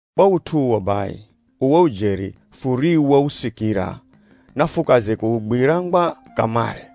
Kwa ut'u uwo bai, uwo ujeri furiwousikira, nafukaze kuugwira ngwa kamare,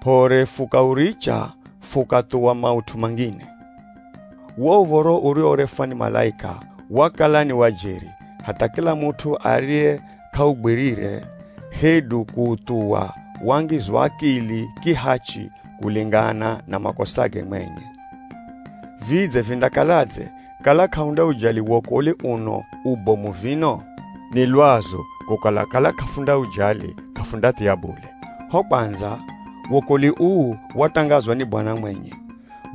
p'ore fukauricha fukathuwa maut'u mangine. Wo uv̱oro uriworefwa ni malaika wakala ni wa jeri hatha kila mut'u ariye k'augwirire hedu kuuthuwa wangizwa akili kihachi kulengana na makosage mwenye. Vidze vindakaladze kala k'ahundaujali wokolwi uno ubomu vino? Ni lwazu kukala kala k'afundaujali, k'afundathia bule. Ho kwandza, wokolwi uu watangazwa ni Bwana mwenye,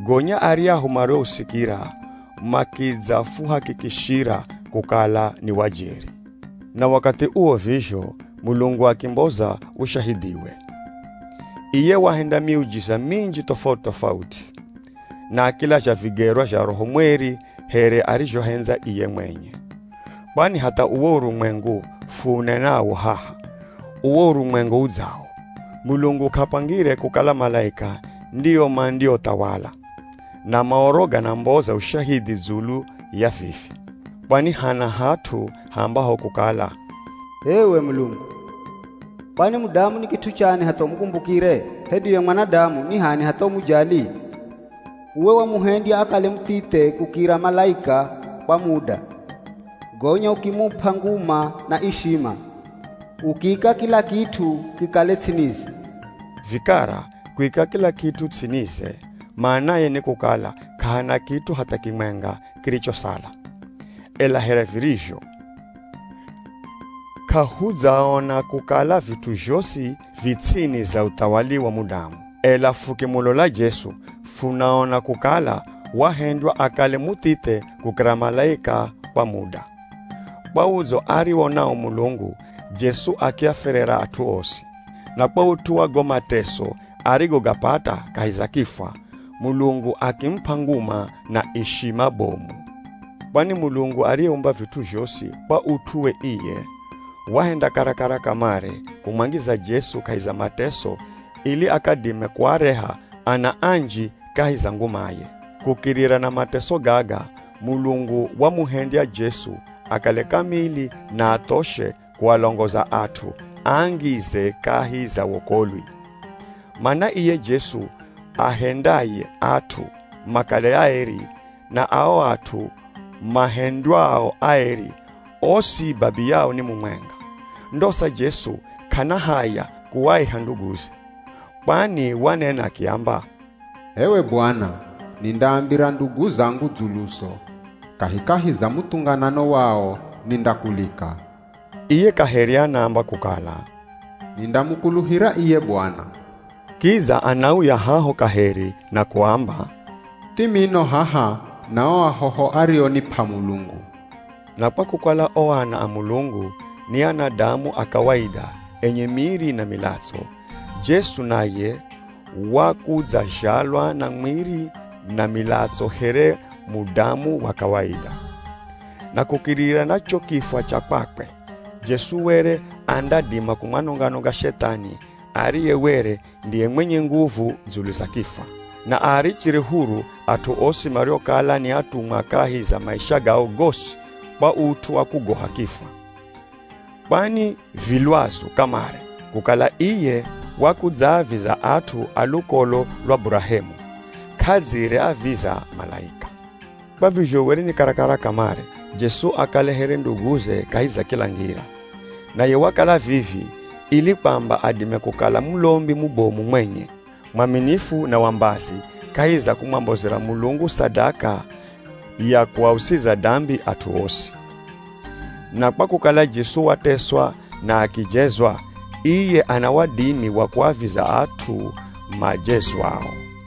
gonya aryahu mariousikira makidzafuhakikishira kukala ni wa jeri. Na wakathi uwo vizho, Mulungu akimboza ushahidhiwe. Iye wahenda miujiza minji tofauti-tofauti, na akilazha vigerwa zha Roho Mweri here arizhohendza iye mwenye. Kwani hatha uwo urumwengu fuunenawo haha, uwo urumwengu udzawo, Mulungu k'apangire kukala malaika ndio mandiothawala. Na Maoro ganamboza ushahidhi dzulu ya vivi. Kwani hana hat'u haambaho kukala, “H'ewe Mulungu, kwani mudamu ni kit'u chani hatha umukumbukire? Hedu ye mwanadamu ni h'ani hatha umujali? Uwe wamuhendya akale muthithe kukira malaika kwa muda, gonya ukimup'a nguma na ishima, ukiika kila kit'u kikale ts'inize.” Vikara, kuika kila kit'u ts'inize, manaye ni kukala k'ahana kit'u hatha kimwenga kirichosala. Ela here virizho, k'ahudzaona kukala vit'u zhosi vi ts'ini za uthawali wa mudamu. Ela fukimulola Jesu, funaona kukala wahendywa akale muthithe kukira malaika kwa muda. Kwa udzo ariwo nawo Mulungu, Jesu akiafwerera at'u osi. Na kwa ut'u wa go mateso arigogapata kahi za kifwa, Mulungu akimup'a nguma na ishima bomu. Kwani Mulungu ariyeumba vit'u zhosi kwa ut'u we iye, wahenda karakara kamare kumwangiza Jesu kahi za mateso ili akadime kuareha ana anji kahi za ngumaye. Kukirira na mateso gaga Mulungu wamuhendya Jesu akale kamili na athoshe kualongoza at'u aangize kahi za wokolwi. Mana iye Jesu aahendaye at'u makale aeri, na ao at'u mahendywao aeri, osi babiyao ni mumwenga. Ndosa Jesu k'ana haya kuaiha nduguze. Kwani wanena akiamba, “H'ewe Bwana, nindaambira ndugu zangu dzuluzo. Kahikahi za muthunganano wao, nindakulika.” Iye kaheri anaamba kukala, “Nindamukuluhira iye Bwana.” Kidza anauya haho kaheri na kuamba, “Thimino haha na o ahoho arionip'a Mulungu.” Na kwa kukala o ana a Mulungu, ni anadamu a kawaida enye miri na milatso, Jesu naye wakudzazhalwa na mwiri na milatso here mudamu wa kawaida. Na kukirira na cho kifwa cha kwakwe, Jesu were andadima kumwanonga-nonga Shethani ariye were ndiye mwenye nguvu dzulu za kifwa, na aarichire huru at'u osi mariokala ni atumwa kahi za maisha gao gosi kwa ut'u wa kugoha kifwa. Kwani vi lwazu kamare kukala iye wakudzaaviza at'u a lukolo lwa Burahemu, k'adzire aviza malaika! Kwa vizho were ni karakara kamare Jesu akale here nduguze kahi za kila ngira. Naye wakala vivi ili kwamba adime kukala mulombi mubomu mwenye, mwaminifu na wa mbazi kahi za kumwambozera Mulungu sadaka ya kuausiza dambi at'u osi. Na kwa kukala Jesu wateswa na akijezwa, iye ana wadimi wa kuaviza at'u majezwao.